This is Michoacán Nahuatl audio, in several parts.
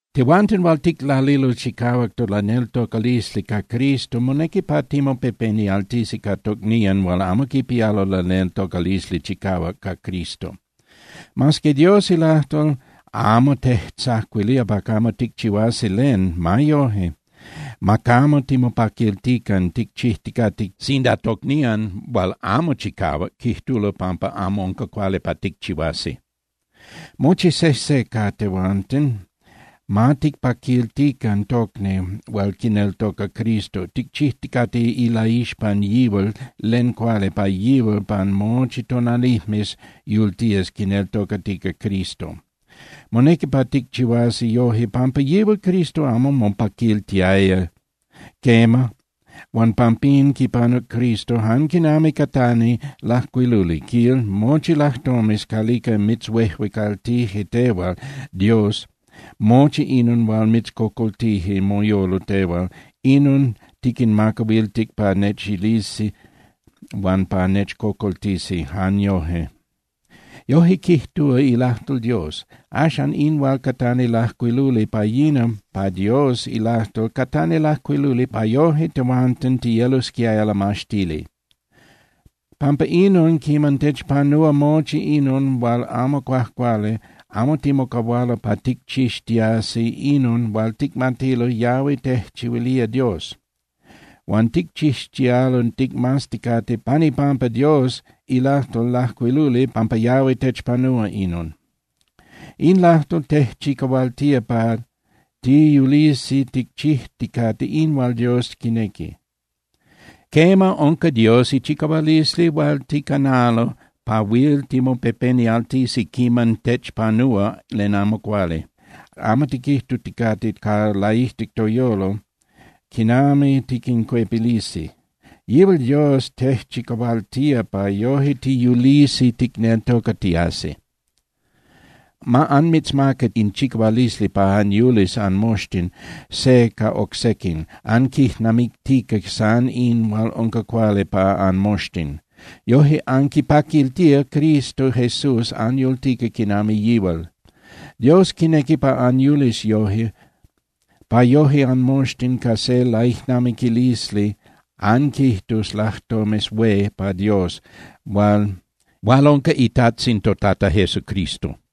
Tehuanten hual ticlalilo chicahuac tolaneltocalisli ca Cristo, monequi pa timopepenialtisi ca tocnían hual amo quipialo laneltocalisli chicahuac ca Cristo. Mas que Dios ilajtol amo tejtzacuilía pa camo ticchihuasi len, ma yoje, ma camo timopaquiltican ticchijticate sinda tocnían hual amo chicahuac quijtulo pampa amo unca cuali pa ticchihuasi. Mochi sejse ca tehuanten, ma ticpaquiltican tocni hual quineltoca Cristo, ticchijticate ilaixpan yihual len cuali pa yihual pan mochi tonalijmes yultías quineltocatica Cristo. Monequi pa ticchihuasi yoje pampa yihual Cristo amo mopaquiltiaya. Quema, huan pampín quipanuc Cristo jan quinami catani lajcuiluli, quil: “Mochi lajtomes calica mitzhuejuecaltije tehual, Dios, mochi inon hual mitzcocoltije moyolo tehual, inon niquinmacahuiltic pa nechilisi huan pa nechcocoltisi jan yoje.” Yoje quijtúa ilajtol Dios. Axan, in hual catani lajcuiluli pa yina pa Dios ilajtol catani lajcuiluli pa yoje tehuanten tiyelosquiaya lamaxtili. Pampa inon, quiman techpanúa mochi inon hual amo cuajcuali, amo timocahualo pa ticchixtiasi inon hual ticmatilo yahui tejchihuilía Dios. Huan ticchixtialo ticmazticate pan ipampa Dios ilajtol lajcuiluli pampa yahui techpanúa inon. In lajtol tejchicahualtía pa tiyulisi ticchijticate in hual Dios quinequi. Quema, unca Dios ichicahualisli hual ticanalo pa huil timopepenialtisi quiman techpanúa len amo cuali, amo tiquijtuticate ca laijtic toyolo quinami tiquincuepilisi. Yihual Dios tejchicahualtía pa yoje tiyulisi ticneltocatiasi. Ma anmitzmaca in chicahualisli pa anyulis anmoxtin se ca oc sequin, anquijnamictica san in hual unca cuali pa anmoxtin. Yoje anquipaquiltía Cristo Jesús anyultica quinami yihual. Dios quinequi pa anyulis yoje, pa yoje anmoxtin ca se laijnamiquilisli anquijtus lajtomes hué pa Dios, hual unca iTajtzin toTata Jesucristo.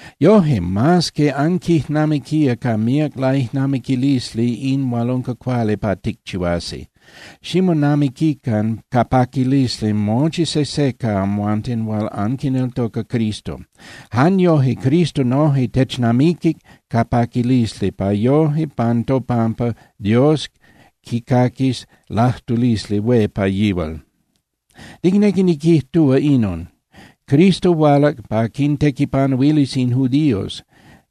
Yoje, mas que anquijnamiquía ca míac laijnamiquilisli in hual unca cuali pa ticchihuasi, ximonamiquican ca paquilisli mochi sejse ca amhuanten hual anquineltoca Cristo. Jan yoje Cristo noje technamiquic ca paquilisli pa yoje pan topampa Dios quicaquis lajtulisli hué pa yihual. Nicnequi niquijtúa inon: Cristo hualac pa quintequipanuilis in judíos,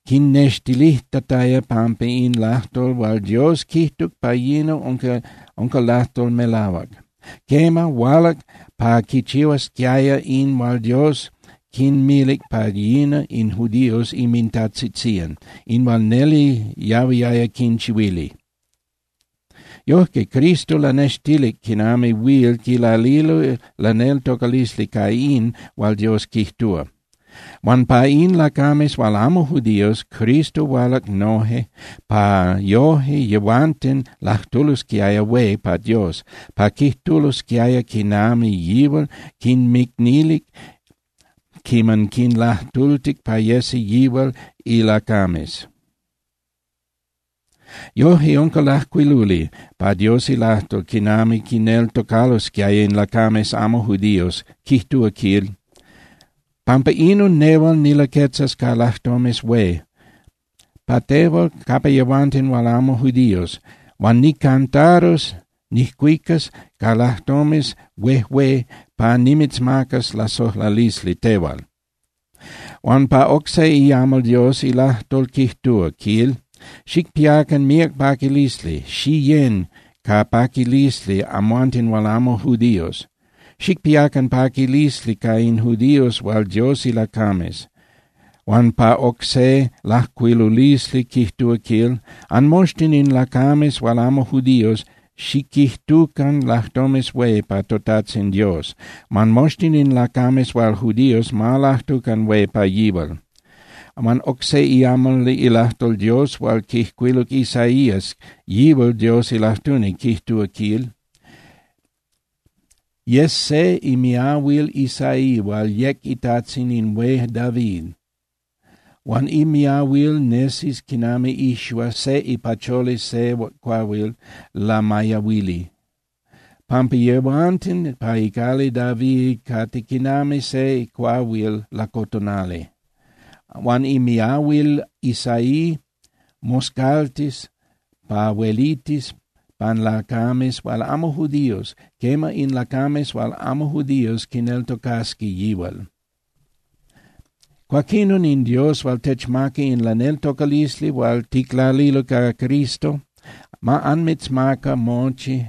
quinnextilijtataya pampa in lajtol hual Dios quijtuc pa yina unca lajtol melahuac. Quema, hualac pa quichihuasquiaya in hual Dios quinmilic pa yina in judíos inmintajtzitzían, in hual neli yahuiaya quinchihuili. Yojque Cristo lanextilic quinami huil quilalilo laneltocalisli ca in hual Dios quijtúa. Huan pa in lacames hual amo judíos, Cristo hualac noje pa yoje yehuanten lajtulosquiaya hué pa Dios, pa quijtulosquiaya quinami yihual quinmicnilic quiman quinlajtultic pa yesi yihual ilacames. Yojque unca lajcuiluli pa Dios ilajtol quinami quineltocalosquiaya in lacames amo judíos, quijtúa, quil: Pampa inon nehual nilaquetzas ca lajtomes hué pa tehual capa yehuanten hual amo judíos, huan nijcantarus (nijcuicas) ca lajtomes huejué pa nimitzmacas lasojlalisli tehual. Huan pa oc se iamal Dios ilajtol quijtúa, quil: Xicpiacan míac paquilisli, xiyén (xiyecan) ca paquilisli amhuanten hual amo judíos. Xicpiacan paquilisli ca in judíos hual Dios ilacames. Huan pa oc se lajcuilulisli quijtúa quil: Anmoxtin in lacames hual amo judíos, xiquijtucan lajtomes hué pa toTajtzin Dios, huan moxtin in lacames hual judíos ma lajtucan hué pa yihual. Huan oc se iamal ilajtol Dios hual quijcuiluc Isaías, yihual Dios ilajtuni, quijtúa, quil: Yes se imiahuil Isaí hual yec itajtzin in hué David. Huan imiahuil nesis quinami ixua se ipacholi se cuahuil lamayahuili, pampa yehuanten ca icali David cate quinami se cuahuil lacotonali. Huan imiahuil Isaí moscaltis pa huelitis pan lacames hual amo judíos, quema, in lacames hual amo judíos quineltocasqui yihual. Cuaquinon in Dios hual techmaca in laneltocalisli hual ticlalilo ca Cristo, ma anmitzmaca mochi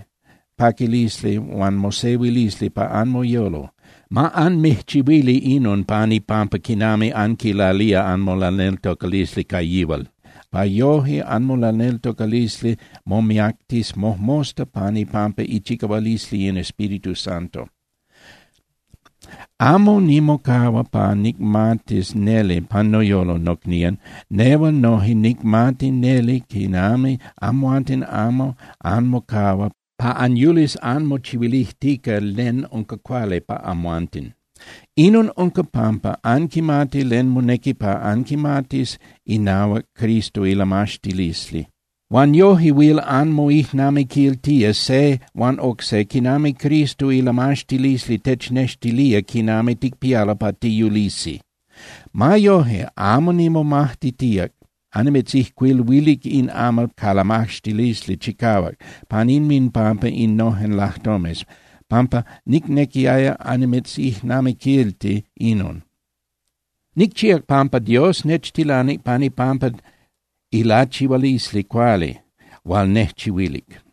paquilisli huan mosehuilisli pa anmoyolo. Ma anmijchihuili inon pan ipampa quinami anquilalía anmolaneltocalisli ca yihual, pa yoje anmolaneltocalisli momiactis mojmosta pan ipampa ichicahualisli in Espíritu Santo. Amo nimocahua pa nicmatis neli pan noyolo, nocnían, nehual noje nicmati neli quinami amhuanten amo anmocahua pa anyulis anmochihuilijtica len unca cuali pa amhuanten. Inon unca pampa anquimati len monequi pa anquimatis inahuac Cristo ilamaxtilisli. Huan yoje huil anmoijnamiquiltía se huan oc se quinami Cristo ilamaxtilisli technextilía quinami ticpialo pa tiyulisi. Ma yoje, amo nimomajtitíac annimitzijcuiluilic in amal ca lamaxtilisli chicahuac pan inminpampa innojen lajtomes, pampa nicnequiaya annimitzijnamiquilti inon. Nicchíac pampa Dios nechtilanic pan ipampa ilachihualisli cuali hual nejchihuilic.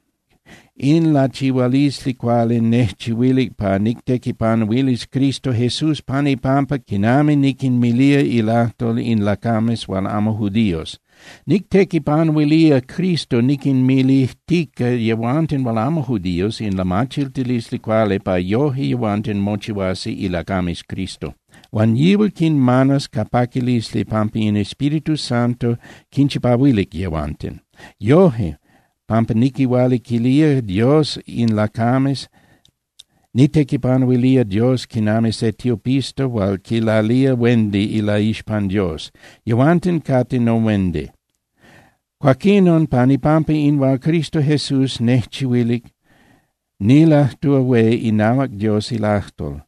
In lachihualisli cuali nejchihuilic pa nictequipanuilis Cristo Jesús pan ipampa quinami niquinmilía ilajtol in lacames hual amo judíos. Nictequipanuilía Cristo niquinmilijtica yehuanten hual amo judíos in lamachiltilisli cuali pa yoje yehuanten mochihuasi ilacames Cristo. Huan yihual quinmanas ca paquilisli pampa in Espíritu Santo quinchipahuilic yehuanten. Yoje, pampa niquihualiquilía Dios in lacames, nictequipanuilía Dios quinami se tiopista hual quilalía huendi ilaixpan Dios. Yehuanten cate nohuendi. Cuaquinon, pan ipampa in hual Cristo Jesús nejchihuilic, nilajtúa hué inahuac Dios ilajtol,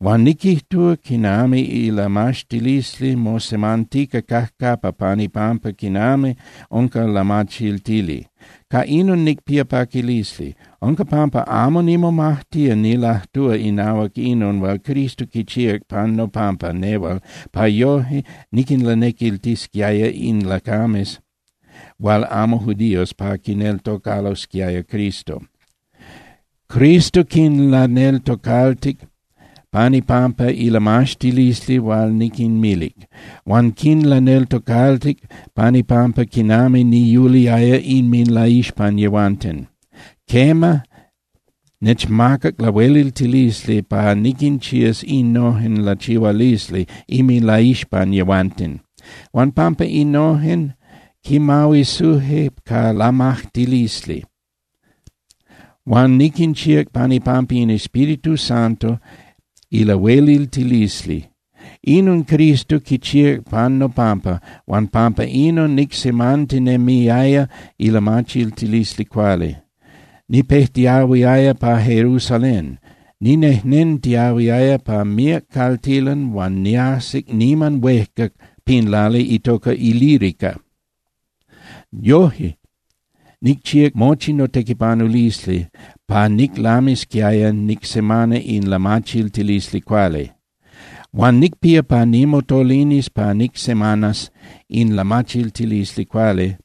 huan niquijtúa quinami ilamaxtilisli mosemantica cajcapa pan ipampa quinami unca lamachiltili. Ca inon nicpía paquilisli. Unca pampa amo nimomajtía nilajtúa inahuac inon hual Cristo quichíac pan nopampa nehual pa yoje niquinlanequiltisquiaya in lacames hual amo judíos pa quineltocalosquiaya Cristo. Cristo quinlaneltocaltic pan ipampa ilamaxtilisli hual niquinmilic. Huan quinlaneltocaltic pan ipampa quinami niyuliaya inminlaixpan yehuanten. Quema, nechmacac lahueliltilisli pa niquinchías innojen lachihualisli inminlaixpan yehuanten. Huan pampa innojen, quimahuisuje ca lamajtilisli. Huan niquinchíac pan ipampa in Espíritu Santo ilahueliltilisli. Inon Cristo quichíac pan nopampa huan pampa inon nicsemantinemiaya ilamachiltilisli cuali. Nipejtiahuiaya pa Jerusalén, ninejnentiahuiaya pa míac caltilan huan niajsic niman huejca pin lali itoca Ilírica. Yoje nicchíac mochi notequipanulisli pa niclamisquiaya nicsemana in lamachiltilisli cuali. Huan nicpía pa nimotolinis pa nicsemanas in lamachiltilisli cuali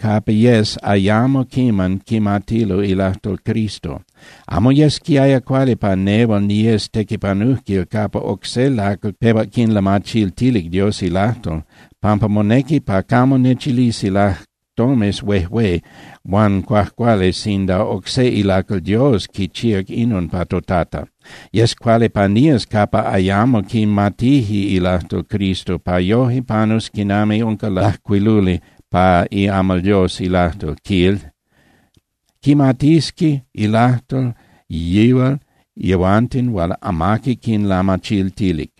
capa yes ayamo quiman quimatilo ilajtol Cristo. Amo yesquiaya cuali pa nehual niyes tequipanujquil capa oc se lacal pehuac quinlamachiltilic Dios ilajtol, pampa monequi pa camo nechilisi lajtomes huejué huan cuajcuali sinda oc se ilacal Dios quichíac inon pa toTata. Yes cuali pa nías capa ayamo quimatije ilajtol Cristo pa yoje panus quinami unca lajcuiluli pa iamal Dios ilajtol, quil: Quimatisqui ilajtol yihual yehuanten hual amaqui quinlamachiltilic,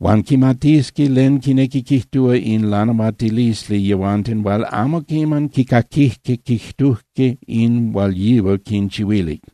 huan quimatisqui len quinequi quijtúa in lanahuatilisli yehuanten hual amo quiman quicaquijque quijtujque in hual yihual quinchihuilic.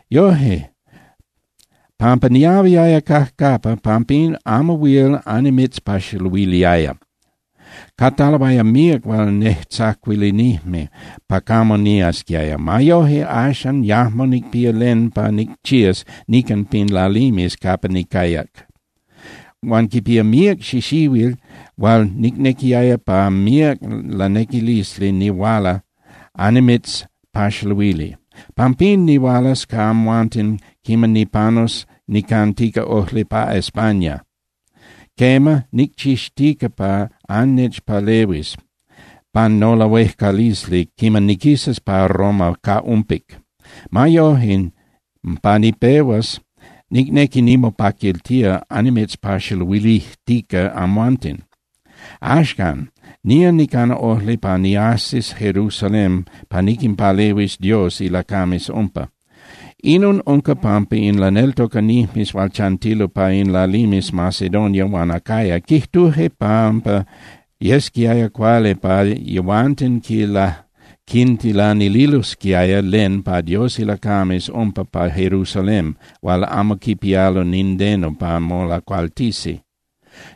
Yoje, pampa niahuiaya cajcapa, pampín amo huil annimitzpaxaluiliaya. Cataloaya míac hual nejtzacuilinijme pa camo niasquiaya. Ma yoje, axan yajmo nicpía len pa nicchías nican pin lalimes capa nicayac. Huan quipía míac xixihuil hual nicnequiaya ca míac lanequilisli nihuala annimitzpaxaluili. Pampín, nihualas ca amhuanten quiman nipanus nicantica ojli pa España. Quema, nicchixtica pa annechpalehuis pan nolahuejcalisli quiman niquisas pa Roma ca umpic. Ma yoje, pa nipehuas, nicnequi nimopaquiltía annimitzpaxaluilijtica amhuanten. Axcan, nía nicana ojli pa niajsis Jerusalén pa niquinpalehuis Dios ilacames umpa. Inon unca pampa in laneltocanijmes hual chantilo pa in lalimes Macedonia huan Acaya quijtuje pampa yesquiaya cuali pa yehuanten quintilanililosquiaya len pa Dios ilacames nepa pa Jerusalén hual amo quipialo nindeno pa molacualtisi.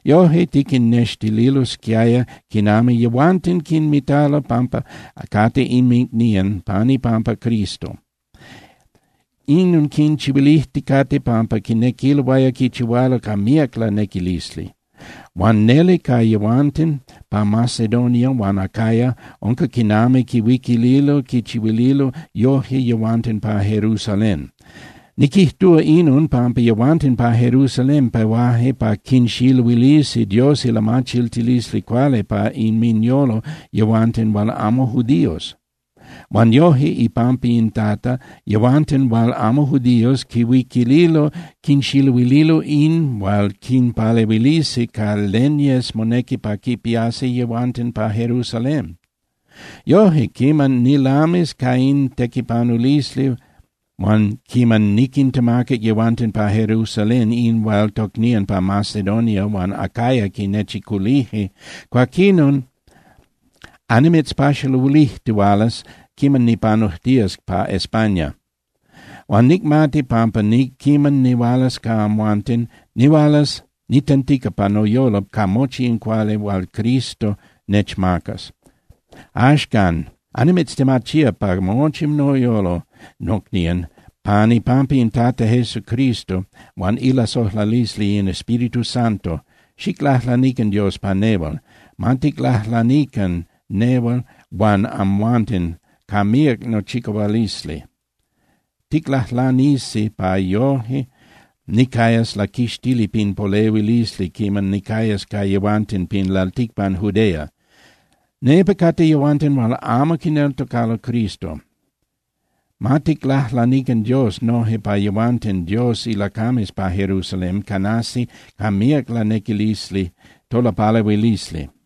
Yoje quinnextililosquiaya quinami yehuanten quinmitalo pampa cate inmicnían pan ipampa Cristo. Inon quinchihuilijticate pampa quinequiloaya quichihualo ca míac lanequilisli. Huan neli ca yehuanten pa Macedonia huan Acaya unca quinami quihuiquililo quinchihuililo yoje yehuanten pa Jerusalén. Niquijtúa inon pampa yehuanten pa Jerusalén pehuaje pa quinxiluilisi Dios ilamachiltilisli cuali pa inminyolo yehuanten hual amo judíos. Huan yoje ipampa in Tata, yehuanten hual amo judíos quihuiquililo quinxiluililo in hual quipialo pa quinpalehuilisi ca len yes monequi pa quipiasi yehuanten pa Jerusalén. Yoje, quiman nilamis ca in tequipanulisli huan quiman niquintemacac yehuanten pa Jerusalén in hual tocnían pa Macedonia huan Acaya quinnechiculije, cuaquinon annimitzpaxaluilijtihualas quiman nipanujtías pa España. Huan nicmati pampa quiman nihualas ca amhuanten, nihualas nitentica pa noyolo ca mochi in cuali hual Cristo nechmacas. Axcan, annimitztemachía ca mochi noyolo, nocnían, pan ipampa in Tata Jesucristo huan ilasojlalisli in Espíritu Santo, xiclajlanican Dios pa nehual. Ma ticlajlanican nehual huan amhuanten ca míac tochicahualisli. Ticlajlanisi pa yoje nicayas laquixtili pin polehuilisli quiman nicayas ca yehuanten pin lalticpan Judea. Nepa cate yehuanten hual amo quineltocalo Cristo. Ma ticlajlanican Dios noje pa yehuanten Dios ilacames pa Jerusalén canasi ca míac lanequilisli tolapalehuilisli.